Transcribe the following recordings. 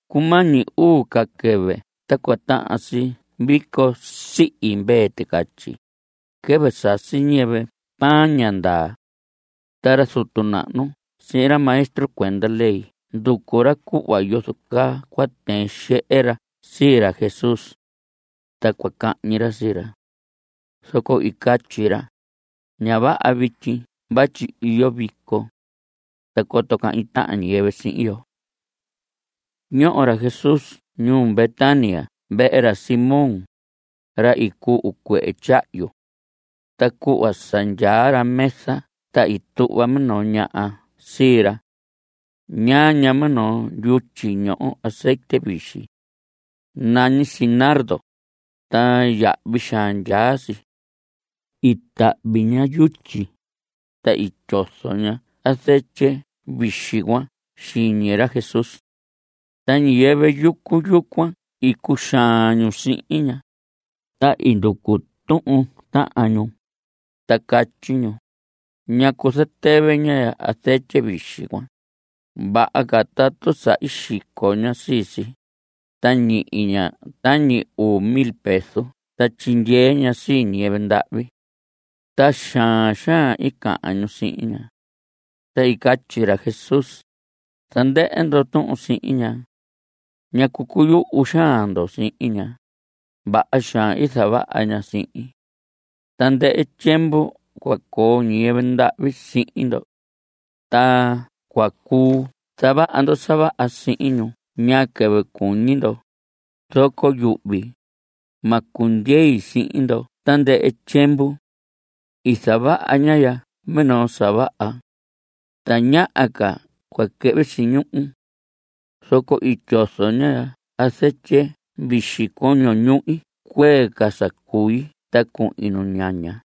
Cumañi uu ca quɨvɨ ta cua tahan si vico sihi mvee ticatyi, quɨvɨ sasi ñiyɨvɨ pan ña ndaa. Ta ra zutu nahnu sihin ra maestro cuenda ley nducu ra cuhva yozo caa cua tɨɨn xehe ra sii ra Jesús. Ta cua cahñi ra sii ra. Zoco i catyi ra: Ña vaha vityi vatyi iyo vico. Ta coto cahñi tahan ñiyɨvɨ sihin yo. Ñoho ra Jesús ñuu Betania vehe ra Simón, ra i cuhu cuehe tyahyu. Ta cuhva sa ndyaa ra mesa ta i tuhva minoo ñaha sii ra. Ñaa ña minoo yutyi ñoho azetye vixi. Nañi si nardo, ta yahvi xaan ndyaa si. I tahvi ña yutyi, ta i tyozo ña azetye vixi cuan xiñi ra Jesús. Ta ñiyɨvɨ yucu yucuan i cuxaan ñu sihin ña, ta i nducu tuhun tahan ñu. Ta catyi ñu: ¿Ñacu zatɨvɨ ña azetye vixi cuan? Vaha ca tatu sa i xico ña sii si, ta ñihi ña tañi uu mil peso ta tyindyee ña sii ñiyɨvɨ ndahvi. Ta xaan xaan i cahan ñu sihin ña. Ta i catyi ra Jesús: Zandɨhɨ ndo tuhun sihin ña. ¿Ñacu cuyuhu xaan ndo sihin ña? Vaha xaan i zavaha ña sihin. Tandɨhɨ tyiemvu cua coo ñiyɨvɨ ndahvi sihin ndo. Ta cua cuu zavaha ndo sa vaha sihin ñu ñaa quɨvɨ cuñi ndo, zoco yuhvi, ma cundyei sihin ndo tandɨhɨ tyiemvu. I zavaha ñaha ya minoo sa vaha. Tañaha ca cua quɨhvi si ñuhu. Zoco i tyozo ña azetye vixi coño ñuhi cuee ca sa cui ta cuhin nuñaña.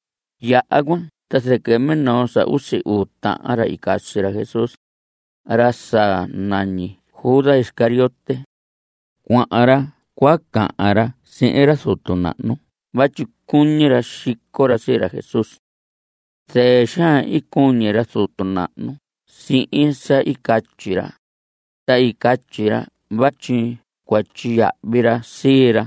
Yaha cuan ta zɨquɨ minoo sa usi uu tahan ra i casi ra Jesús, ra sa nañi Judas Iscariote, cuahan ra cua cahan ra sihin ra zutu nahnu vatyi cuñi ra xico ra sii ra Jesús. Zɨɨ xaan i cuñi ra zutu nahnu sihin sa i catyi ra, ta i catyi ra vatyi cua tyiyahvi ra sii ra.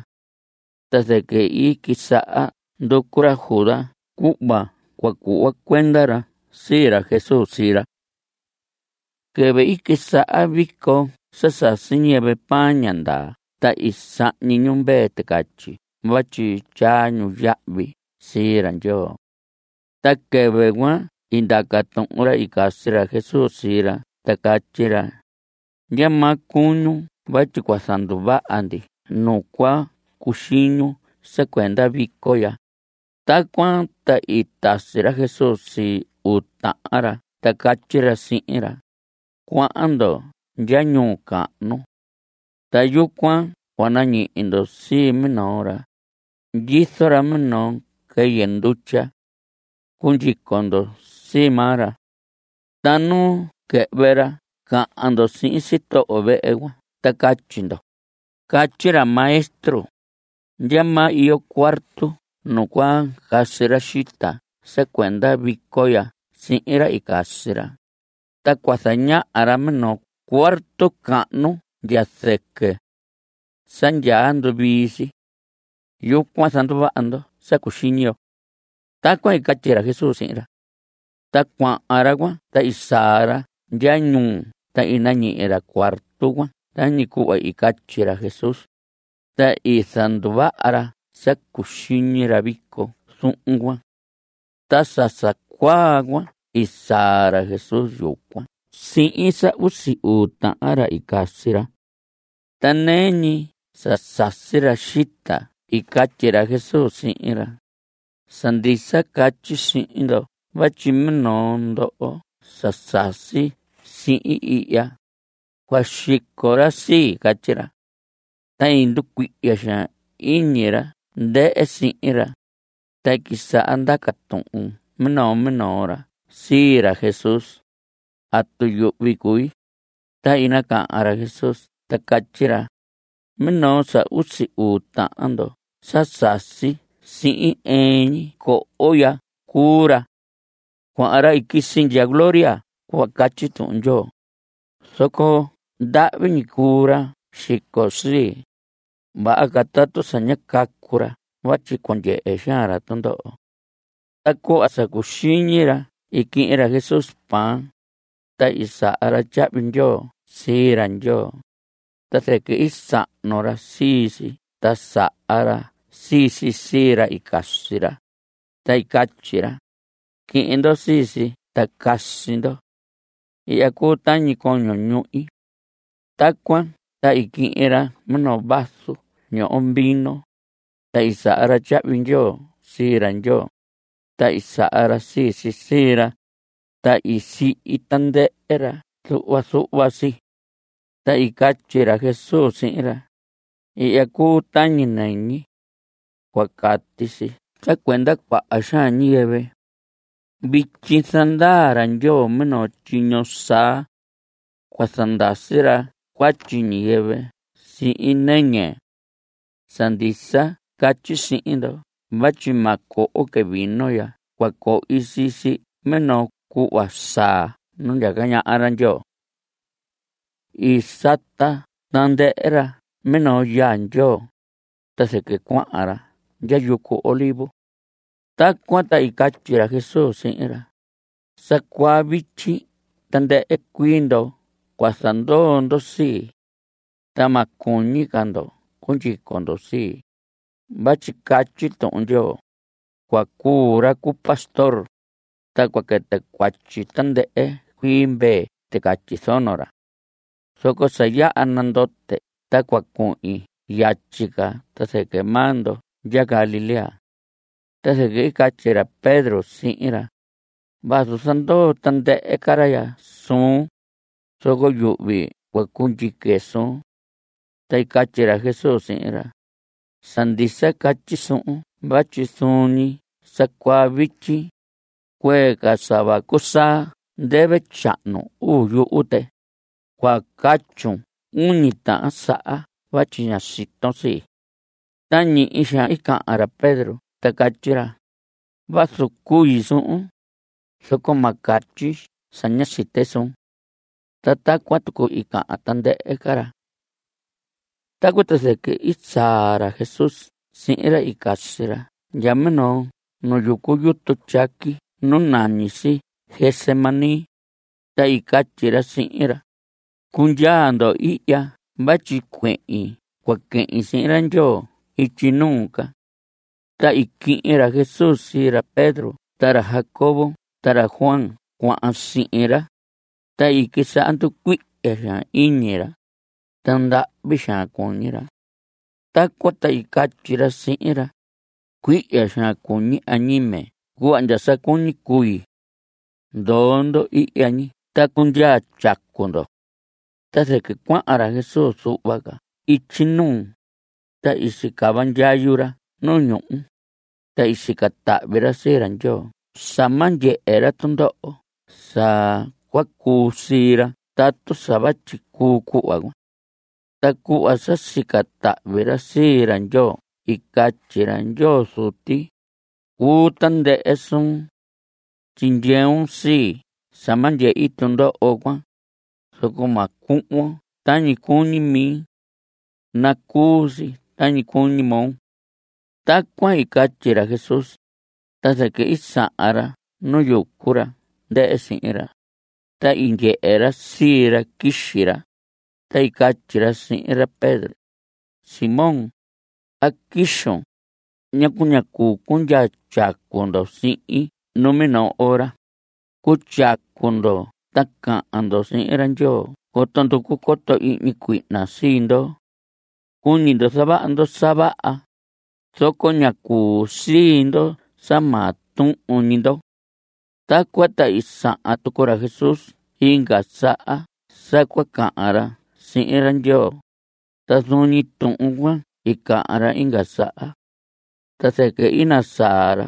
Ta zɨquɨ i quisaha nducu ra Judas cuhva cua cuhva cuenda ra sii ra Jesús sii ra. Quɨvɨ i quisaha vico sa sasi ñiyɨvɨ pan ña ndaa ta i sahñi ñu mvee ticatyi vatyi tyaa ñu yahvi sii ra Ndyoo. Ta quɨvɨ cuan i ndaca tuhun ra i casi ra Jesús sii ra ta catyi ra: ¿Ndyamaa cuñun vatyi cua zanduvaha ndi nu cua cuxiñun sa cuenda vico ya? Tacuan ta i tasi ra Jesús sii uu tahan ra ta catyi ra sihin ra: Cuahan ndo ndya ñuu cahnu. Ta yucuan cua nañihi ndo sii minoo ra; ndyizo ra minoo quɨyɨ ndutya. Cundyico ndo sii maa ra. Ta nu quɨhvɨ ra cahan ndo sihin sitoho vehe cuan ta catyi ndo: “Catyi ra Maestro: ¿Ndyamaa iyo cuarto nu cua casi ra xita sa cuenda vico ya sihin ra i casi ra?” Ta cua zañaha ra minoo cuarto cahnu ndya zɨquɨ. Sa yaha nduvii si. Yucuan zanduvaha ndo sa cuxiñi yo. Tacuan i catyi ra Jesús sihin ra. Ta cuahan ra cuan ta i saa ra ndya ñuu ta i nañihi ra cuarto cuan tañi cuhva i catyi ra Jesús. Ta i zanduvaha ra sa cuxiñi ra vico zuhun cuan. Ta sa sa cuaa cuan i saa ra Jesús yucuan sihin sa usi uu tahan ra i casi ra. Ta nɨɨ ñi sa sasi ra xita i catyi ra Jesús sihin ra: Sa ndisa catyi sihin ndo vatyi minoo ndoho sa sasi sihin ihya, cua xico ra sii. Catyi ra. Ta i nducuihya xaan iñi ra ndɨhɨ sihin ra, ta i quisaha ndaca tuhun minoo minoo ra sii ra Jesús: ¿Atu yuhvi cui? Ta i nacahan ra Jesús ta catyi ra: Minoo sa usi uu tahan ndo sa sasi sihin ɨɨn ñi coho ya cuu ra. Cuahan ra i quisi ndya gloria cuhva catyi Tuhun Ndyoo, zoco ¡ndahvi ñi cuu ra xico sii! Vaha ca tatu sa ñá cacu ra vatyi cua ndyehe xaan ra tundoho. Ta cuhva sa cuxiñi ra i quihin ra Jesús pan, ta i saha ra tyahvi ndyoo sii ra Ndyoo, ta zɨquɨ i sahnu ra sii si ta saha ra sii si sii ra i casi ra, ta i catyi ra: Quihin ndo sii si ta casi ndo. Ihya cuu tañi coño ñuhi. Tacuan ta i quihin ra minoo vaso ñoho vino, ta i saha ra tyahvi ndyoo sii ra Ndyoo, ta i saha ra sii si sii ra, ta i sihi tandɨhɨ ra zuhva zuhva si. Ta i catyi ra Jesús sihin ra: Ihya cuu tañi nɨñi. Cua cati si sa cuenda cuaha xaan ñiyɨvɨ. Vityi zandaa ra Ndyoo minoo tyiño saa. Cua zandasi ra cuatyi ñiyɨvɨ sihin nɨñi. Sa ndisa catyi sihin ndo vatyi ma coho que vino ndya cua cohi sii si minoo cuhva saa nu ndyaca ñaha ra Ndyoo. I sata tandɨhɨ ra minoo yaa Ndyoo, ta zɨquɨ cuahan ra ndya yucu Olivos. Tacuan ta i catyi ra Jesús sihin ra: Sa cuaa vityi tandɨhɨ cuii ndo cua zandoo ndo sii. Ta ma cuñi ca ndo cundyico ndo sii, vatyi catyi Tuhun Ndyoo: “Cua cuu ra cu pastor, ta cua quɨtɨ cuatyi tandɨhɨ cuii mvee ticatyi zono ra.” Zoco sa yaha nandote ta cua cuhin yatyi ca ta zɨquɨ maa ndo ndya Galilea. Ta zɨquɨ i catyi ra Pedro sihin ra: Vazu zandoo tandɨhɨ ca ra ya suun, zoco yuhvi cua cundyique suun. Ta i catyi ra Jesús sihin ra: Sa ndisa catyi suhun vatyi zuun ñi sa cuaa vityi, cuee ca sa vacu saa ndɨvɨ tyahnu uu yuhu tɨ, cua catyun uñi tahan saha vatyi ña siton sii. Ta ñihi xaan i cahan ra Pedro ta catyi ra: Vazu cui suhun, zoco ma catyi sa ña site suun. Ta tacuan tucu i cahan tandɨhɨ ca ra. Tacuan ta zɨquɨ i saa ra Jesús sihin ra i casi ra ndya minoo nu yucu yutu tyaqui nu nañi si Getsemaní, ta i catyi ra sihin ra: Cundyaa ndo ihya vatyi cuehin cua quehin sihin ra Ndyoo ityi nuu ca. Ta i quihin ra Jesús sii ra Pedro ta ra Jacobo ta ra Juan cuahan sihin ra, ta i quisaha nducuihya xaan iñi ra, ta ndahvi xaan cuñi ra. Tacuan ta i catyi ra sihin ra: Cuihya xaan cuñi añime cuhva ndya sa cuñi cui. Ndoo ndo ihya ñi ta cundyaa tyacu ndo. Ta zɨquɨ cuahan ra Jesús zuhva ca ityi nuu, ta i sicava ndyayu ra nu ñuhu, ta i sica tahvi ra sii ra Ndyoo sa ma ndyehe ra tundoho sa cua cuu sii ra tatu sa vatyi cuu cuhva cuan. Ta cuhva sa sica tahvi ra sii ra Ndyoo i catyi ra: Ndyoo Zuti, cuu tandɨhɨ suun. Tyindyeun sii sa ma ndyehi tundoho cuan, zoco ma cuhvon tañi cuñi mi. Nacuu si tañi cuñi moo. Tacuan i catyi ra Jesús, ta zɨquɨ i sahan ra nu yucu ra ndɨhɨ sihin ra, ta i ndyehe ra sii ra quixi ra, ta i catyi ra sihin ra Pedro: Simón, ¿a quixun? ¿Ñacu ñá cuu cundyaa tyacu ndo sihin numinoo ora? Cutyacu ndo ta cahan ndo sihin ra Ndyoo coto nducu coto ihñi cuihna sii ndo. Cuñi ndo zavaha ndo sa vaha, zoco ña cuu sii ndo sa maa tuhun ñi ndo. Tacuan ta i sahan tucu ra Jesús inga saha sa cua cahan ra sihin ra Ndyoo, ta zuun ñi tuhun cuan i cahan ra inga saha. Ta zɨquɨ i nasaa ra,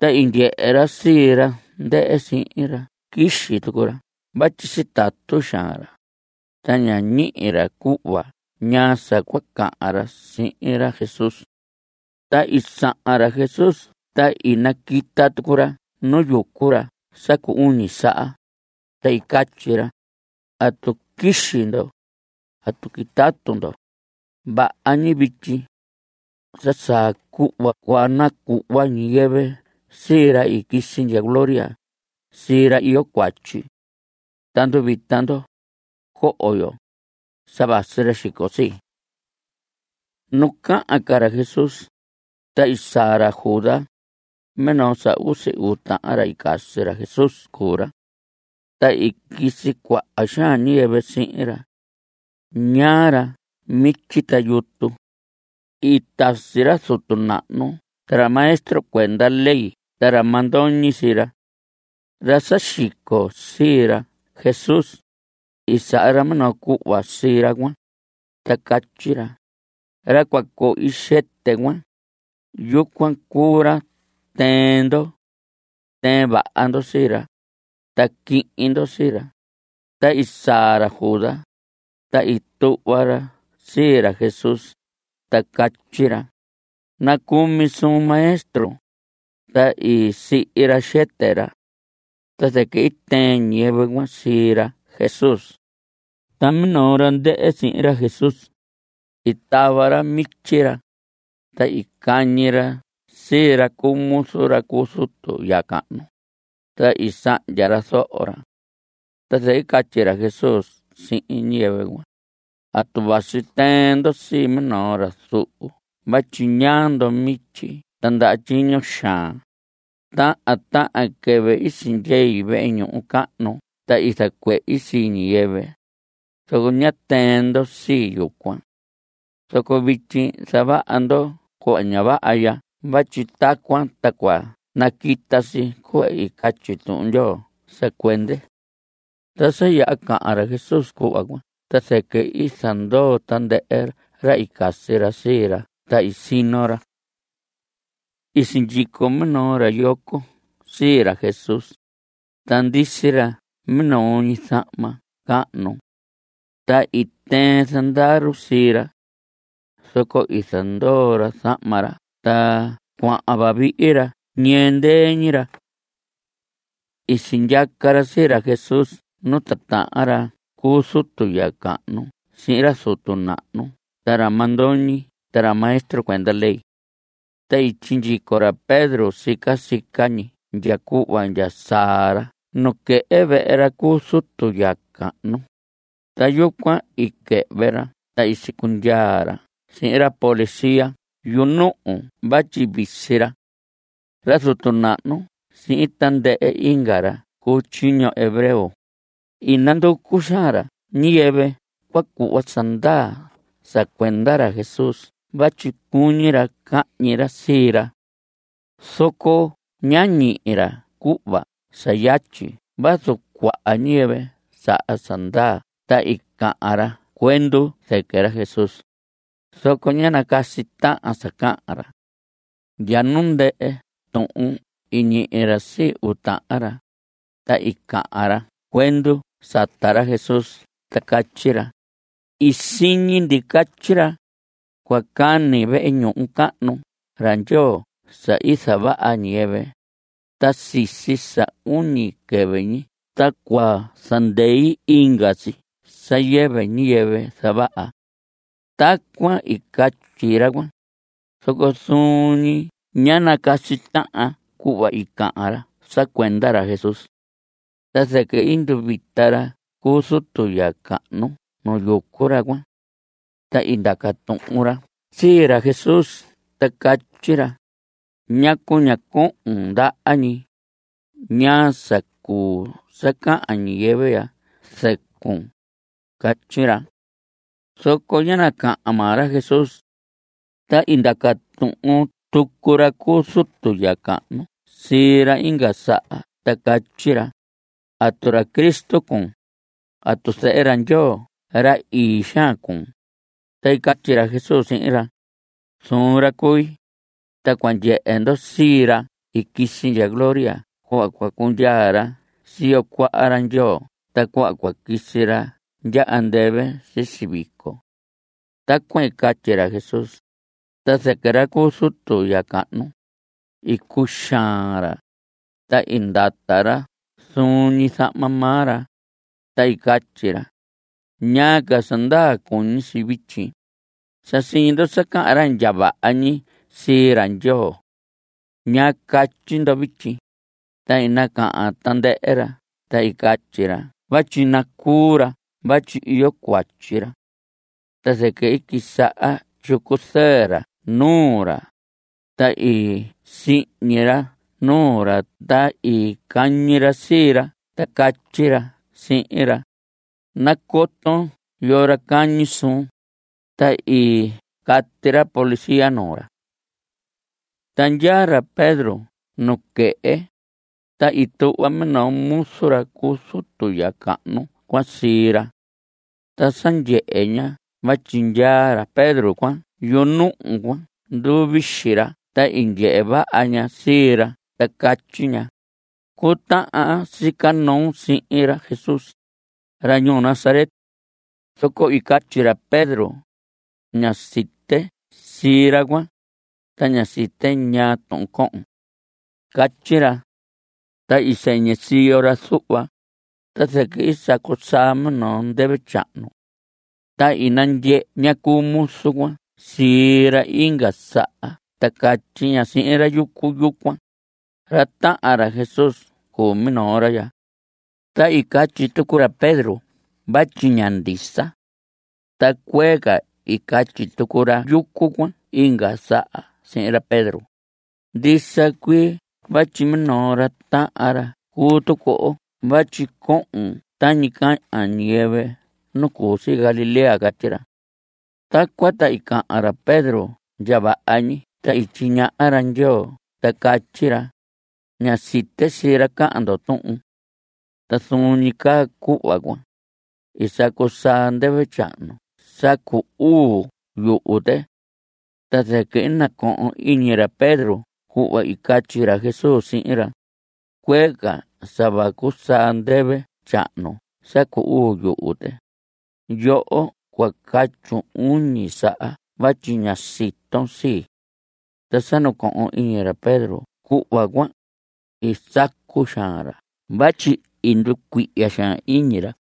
ta i ndyehe ra sii ra ndɨhɨ sihin ra quixi tucu ra vatyi sitatu xaan ra, ta ñá ñihi ra cuhva ñaa sa cua cahan ra sihin ra Jesús. Ta i sahan ra Jesús ta i naquita tucu ra nu yucu ra sa cu uñi saha, ta i catyi ra: ¿Atu quixi ndo? ¿Atu quitatu ndo? Vaha ñi vityi. Sa saa cuhva cua nacuhva ñiyɨvɨ sii ra i quisi ndya gloria sii ra iyo cuatyi. Ta nduvita ndo. Coho yo. Sa vasi ra xico sii. Nu cahan ca ra Jesús, ta i saa ra Judas; minoo sa usi uu tahan ra i casi ra Jesús cuu ra. Ta i quisi cuaha xaan ñiyɨvɨ sihin ra. Ñaa ra mityi ta yutu. I tasi ra zutu nahnu ta ra maestro cuenda ley ta ra mandoñi sii ra. Ra sa xico sii ra Jesús, i saha ra minoo cuhva sii ra cuan, ta catyi ra: Ra cua cohi xɨtɨ cuan, yucuan cuu ra tɨɨn ndo. Tɨɨn vaha ndo sii ra, ta quihin ndo sii ra. Ta i saa ra Judas, ta i tuhva ra sii ra Jesús ta catyi ra: Nacumi suun, Maestro. Ta i sihi ra xɨtɨ ra. Ta zɨquɨ i tɨɨn ñiyɨvɨ cuan sii ra Jesús. Ta minoo ra ndɨhɨ sihin ra Jesús, i tava ra mityi ra, ta i cañi ra sii ra cu muzu ra cu zutu ya cahnu, ta i sahndya ra zoho ra. Ta zɨquɨ i catyi ra Jesús sihin ñiyɨvɨ cuan: ¿Atu vasi tɨɨn ndo sii minoo ra zuhu vatyi ñaa ndo mityi ta ndaha tyiño xaan? Tahan tahan quɨvɨ i sehin vehe ñuhu cahnu ta i zacuehi sii ñiyɨvɨ, zoco ñá tɨɨn ndo sii yucuan. Zoco vityi zavaha ndo cuhva ña vaha ya vatyi tacuan ta cua naquita si cuhva catyi Tuhun Ndyoo sa cuende. Ta sa yaha cahan ra Jesús cuhva cuan ta zɨquɨ i zandoo tandɨhɨ ra i casi ra sii ra ta i sino ra. I sindyico minoo ra yoco sii ra Jesús, ta ndisi ra minoo ñi zahma cahnu. Ta i tɨɨn zandaru sii ra. Zoco i zandoo ra zahma ra ta cuahan vavihi ra ñɨɨ ndɨɨ ñi ra. I sindyaca ra sii ra Jesús nu titahan ra cu zutu ya cahnu sihin ra zutu nahnu ta ra mandoñi ta ra maestro cuenda ley. Ta i sindyico ra Pedro sica sica ñi ndya cuhva ndya saa ra nuquehe vehe ra cu zutu ya cahnu, ta yucuan i quɨhvɨ ra ta i sicundyaa ra sihin ra policía yunuhu vatyi visi ra. Ra zutu nahnu sihin tandɨhɨ inga ra cu tyiño hebreo, i oanducu xaan ra ñiyɨvɨ cua cuhva sa ndaa sa cuenda ra Jesús vatyi cuñi ra cahñi ra sii ra. Zoco ñá ñihi ra cuhva sa yatyi vazu cuaha ñiyɨvɨ saha sa ndaa ta i cahan ra cuendu zɨquɨ ra Jesús, zoco ñá nacasi tahan sa cahan ra. Ndya nu ndɨhɨ tuhun i ñihi ra sii uu tahan ra, ta i cahan ra cuendu sata ra Jesús ta catyi ra: I siñi ndi catyi ra: “Cua cani vehe ñuhu cahnu ra Ndyoo sa i zavaha ñiyɨvɨ, ta sisi sa uñi quɨvɨ ñi ta cua zandei inga si sa yɨvɨ ñiyɨvɨ zavaha.” Tacuan i catyi ra cuan, zoco zuun ñi ñá nacasi tahan cuhva i cahan ra sa cuenda ra Jesús. Ta zɨquɨ i nduvita ra cu zutu ya cahnu nu yucu ra cuan. Ta i ndaca tuhun ra sii ra Jesús ta catyi ra: ¿Ñacu ña cohon ndaha ñi? ¿Ñaa sa cuu sa cahan ñiyɨvɨ ya zɨcun? Catyi ra. Zoco ñá nacahan maa ra Jesús. Ta i ndaca tuhun tucu ra cu zutu ya cahnu sii ra inga saha ta catyi ra: ¿Atu ra Cristo cuun? ¿Atu zehe ra Ndyoo ra ii xaan cuun? Ta i catyi ra Jesús sihin ra: Zuun ra cui, ta cua ndyehe ndo sii ra i quisi ndya gloria cuhva cundyaa ra siyo cuaha ra Ndyoo ta cuhva cua quisi ra ndya andɨvɨ sisi vico. Tacuan i catyi ra Jesús, ta zɨquɨ ra cu zutu ya cahnu, i cuxaan ra, ta i ndata ra zuun ñi zahma maa ra, ta i catyi ra: ¿Ñaa ca sa ndaa cuñi si vityi? Sa siñi ndo sa cahan ra ndya vaha ñi sii ra Ndyoo. ¿Ñaa catyi ndo vityi? Ta i nacahan tandɨhɨ ra ta i catyi ra vatyi nacuu ra vatyi iyo cuatyi ra. Ta zɨquɨ i quisaha tyicu zɨɨ ra nuu ra, ta i sihñi ra nuu ra, ta i cañi ra sii ra ta catyi ra sihin ra: ¡Nacoton yoo ra cañi suun! Ta i cati ra policía nuu ra. Ta ndyaa ra Pedro nuquehe, ta i tuhva minoo muzu ra cu zutu ya cahnu cuan sii ra. Ta sa ndyehe ña vatyi ndyaa ra Pedro cuan yunuhu cuan nduvixi ra ta i ndyehe vaha ña sii ra ta catyi ña: Cutahan aan sica noon sihin ra Jesús, ra ñuu Nazaret. Zoco i catyi ra Pedro: Ña site sii ra cuan, ta ña site ñaa tuhun cohon. Catyi ra. Ta i sɨñɨ siyo ra zuhva, ta zɨquɨ i sacu saa minoo ndɨvɨ tyahnu. Ta i nandyehe ña cu muzu cuan sii ra inga saha ta catyi ña sihin ra yucu yucuan: Ra tahan ra Jesús cuu minoo ra ya. Ta i catyi tucu ra Pedro vatyi ña ndisa. Ta cuee ca i catyi tucu ra yucu cuan inga saha sihin ra Pedro: Ndisa cuii vatyi minoo ra tahan ra cuu tucu oo vatyi cohon tañi cahan ñiyɨvɨ nu cu si Galilea. Catyi ra. Tacuan ta i cahan ra Pedro ndya vaha ñi ta i tyiñaha ra ndyoo ta catyi ra: Ña site sii ra cahan ndoho tuhun. Ta zuun ñi caa cuhva cuan, i sacu saa ndɨvɨ tyahnu sa cu uu yuhu tɨ. Ta zɨquɨ i nacohon iñi ra Pedro cuhva i catyi ra Jesús sihin ra: “Cuee ca sa vacu saa ndɨvɨ tyahnu sa cu uu yuhu tɨ, yoho cua catyun uñi saha vatyi ña siton sii.” Ta sa nacohon iñi ra Pedro cuhva cuan, i sacu xaan ra vatyi i nducuihya xaan iñi ra.